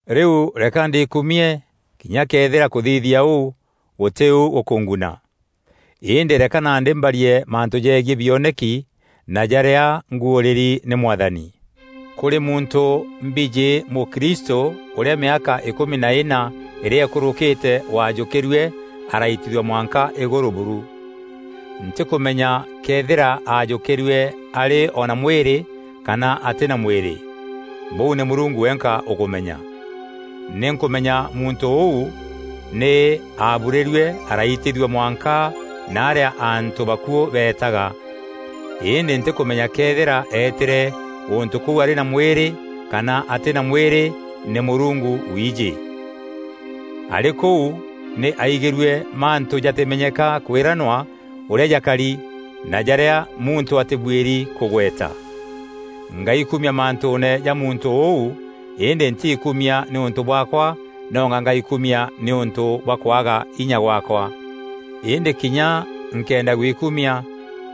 Rîu reka ndiikumie, kinya këethîra kûthithia ûu gûtî u gûkûnguna. Îndî reka nandî mbarie mantû jegiî bioneki na jarîa nguûrîri nî Mwathani. Kûrî muntû mbijî mûkristû ûrîa mîaka îkûmi na îna îrîa îkûrûkîte waajûkîrue araitithua mwanka îgûrû buru. Ntîkûmenya këethîra aajûkîrue arî o na mwîrî kana atî na mwîrî, bûu nî Mûrungu wenka ûkûmenya. Nî nkûmenya muntû ûu nî aaburîrue araitithua mwanka narîa antû bakuû beetaga. Îndî ntîkûmenya këethîra eetîre gûntû kûu arî na mwîrî kana atî na mwîrî, nî Mûrungu wiijî. Arî kûu nî aaigîrue mantû jatîmenyeka kwîranwa ûrîa jakari na jarîa muntû atîbuîri kûgweta. Ngaikumia mantûûne ja muntû ûu îndî ntiikumia nîûntû bwaakwa nonga ngaikumia nîûntû bwa kwaga inya gwaakwa. Îndî kinya nkenda gwikumia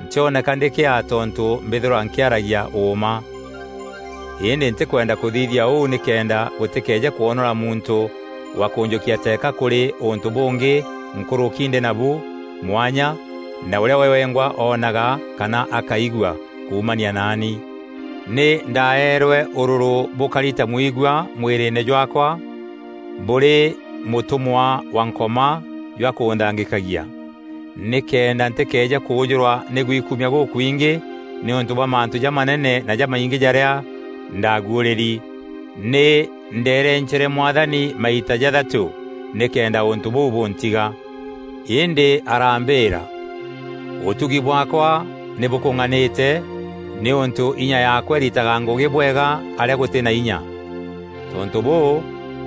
ntîoneka ndî kîaa tontû mbîthîrwa nkîaragia ûûma. Îndî ntîkwenda kûthithia ûu nîkenda gûtîkeeje kwonora muntû wa kûnjûkia teeka kûrî ûntû bûngî nkûrûki ndî nabu mwanya na ûrîa we wengwa oonaga kana akaigua kuumania naani. Nî ndaeerwe ûrûrû bûkari ta mwigua mwîrîîne jwaakwa bûrî mûtûmwa wa Nkoma jwa kûnthangîkagia, nîkenda ntîkeeje kûûjûrwa nî gwikumia gûkwingî nîûntû bwa mantû jamanene na jamaingî jaarîa ndaguûrîri. Nî ndeerencere Mwathani maita jathatû nîkenda ûntû bûu bûntiga, îndî arambîîra, “Ûtugi bwaakwa nî bûkûng'anîte nîûntû inya yaakwa îritaga ngûgî bwega arîa gûtî na inya.” Tontû bûû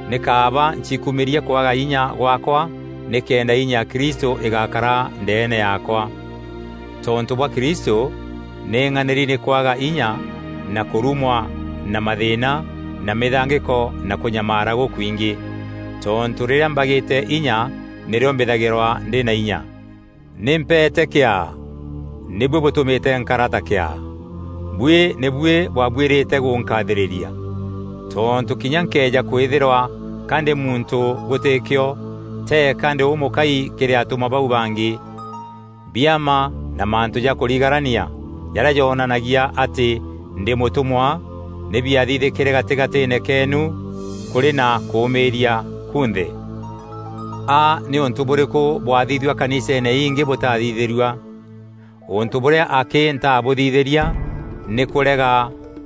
nî kaaba nciikumîrie kwaga inya gwaakwa nîkenda inya ya Kristû îgakara ndeene yaakwa. Tontû bwa Kristû, nî ng'anîri nî kwaga inya na kûrumwa na mathîîna na mîthangîko na kûnyamaara gûkwingî. Tontû rîrîa mbagîte inya nîrîo mbîthagîrwa ndî na inya. Nî mpeete kîaa! Nî buî bûtûmîte nkara ta kîaa. Buî nî buî bwaabuîrîte gûnkaathîrîria. Tontû kinya nkëeja kwîthîrwa ka ndî muntû gûtî kîo, teeka ndî ûmûkai kîrî atûmwa bau bangî. Biama na mantû ja kûrigarania jarîa jonanagia atî ndî mûtûmwa nî biathithîkîre gatîgatîîne keenu kûrî na kûûmîîria kunthe. A nî ûntû bûrîku bwaathithua kaniseene ingî bûtathithîrua? Ûntû bûrîa akî ntaabûthithîria nî kûrega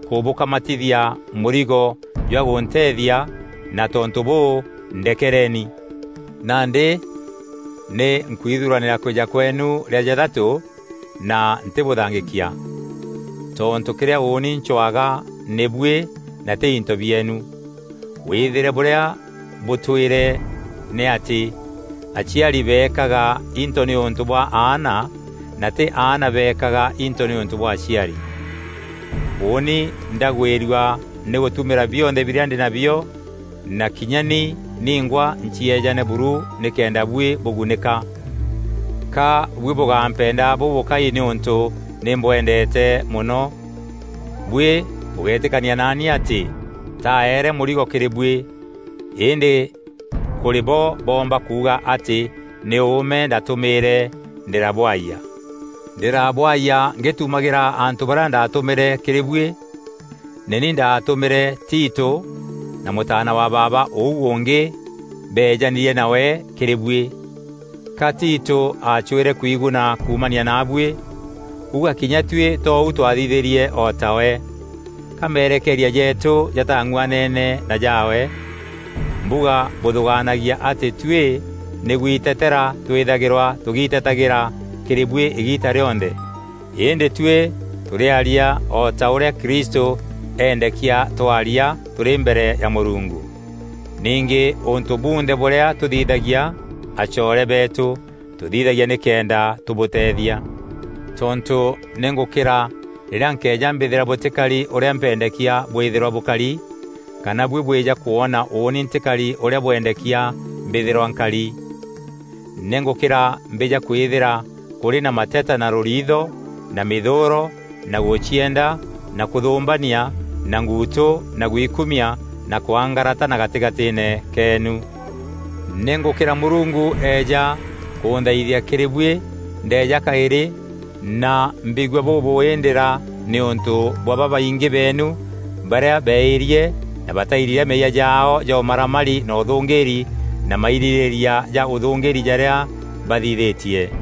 kûbûkamatithia mûrigo jwa gûnteethia na tontû bûû ndekereeni! Nandî nî nkwithuranîra kwîja kweenu rîa jathatû na ntîbûthangîkia. Tontû kîrîa ûûni ncwaga nî buî na tî into bieenu. Wîthîre bûrîa bûtwîre nî atî aciari beekaga into nîûntû bwa aana na tî aana beekaga into nîûntû bwa aciari. Ûûni ndagwîrua nî gûtumîra bionthe birîa ndî nabio na kinya ni ningwa ncieejane buru nîkenda buî bûgunîka. Ka buî bûgampenda bûbûkai nîûntû nî mbwendeete mono? Buî bûgeetîkania naani atî ntaeere mûrigo kîrî buî. Îndî kûrî bo boomba kuuga atî nî ûûme ndaatumîîre ndîrabwayia. Ndîrabwaayia ngîtumagîra antû barîa ndatûmîre kîrî buî? Nî ni ndaatûmîre Tito na mûtaana wa baaba ûu ûngî beejanîrie nawe kîrî buî. Ka Tito aacwîre kwiguna kuumania naabuî? Uga kinya tuî tou twathithîrie o tawe? Ka merekeeria jeetû jataang'uanene na jaawe? Mbuga bûthûgaanagia atî tuî nî gwiteteera twîthagîrwa tûgiitetagîîra kîrî buî îgiita rîonthe. Îndî tuî tûrîaria o ta ûrîa Kristû eendekia twaria tûrî mbere ya Mûrungu. Ningî ûntû bunthe bûrîa tûthithagia, acoore beetû, tûthithagia nîkenda tûbûteethia. Tontû nî ngûkîra rîrîa nkeeja mbîthîra bûtîkari ûrîa mpendekia bwîthîrwa bûkari, kana buî bwîja kwona ûûni ntîkari ûrîa bwendekia mbîthîrwa nkari. Nî ngûkîra mbîja kwîthîra kûrî na mateta na rûriitho na mîthûûro na gûcienda na kûthûmbania na nguutû na gwikumia na kwangaratana gatîgatîîne keenu. Nî ngûkîra Mûrungu eeja kûnthaithia kîrî buî ndeeja kaîrî na mbigua bûbûûî ndîra nîûntû bwa babaingî beenu barîa beeîrie na batairira meeyia jaao ja ûmaramari na ûthûngîîri na mairîrîîria ja ûthûngîîri jarîa bathithîtie.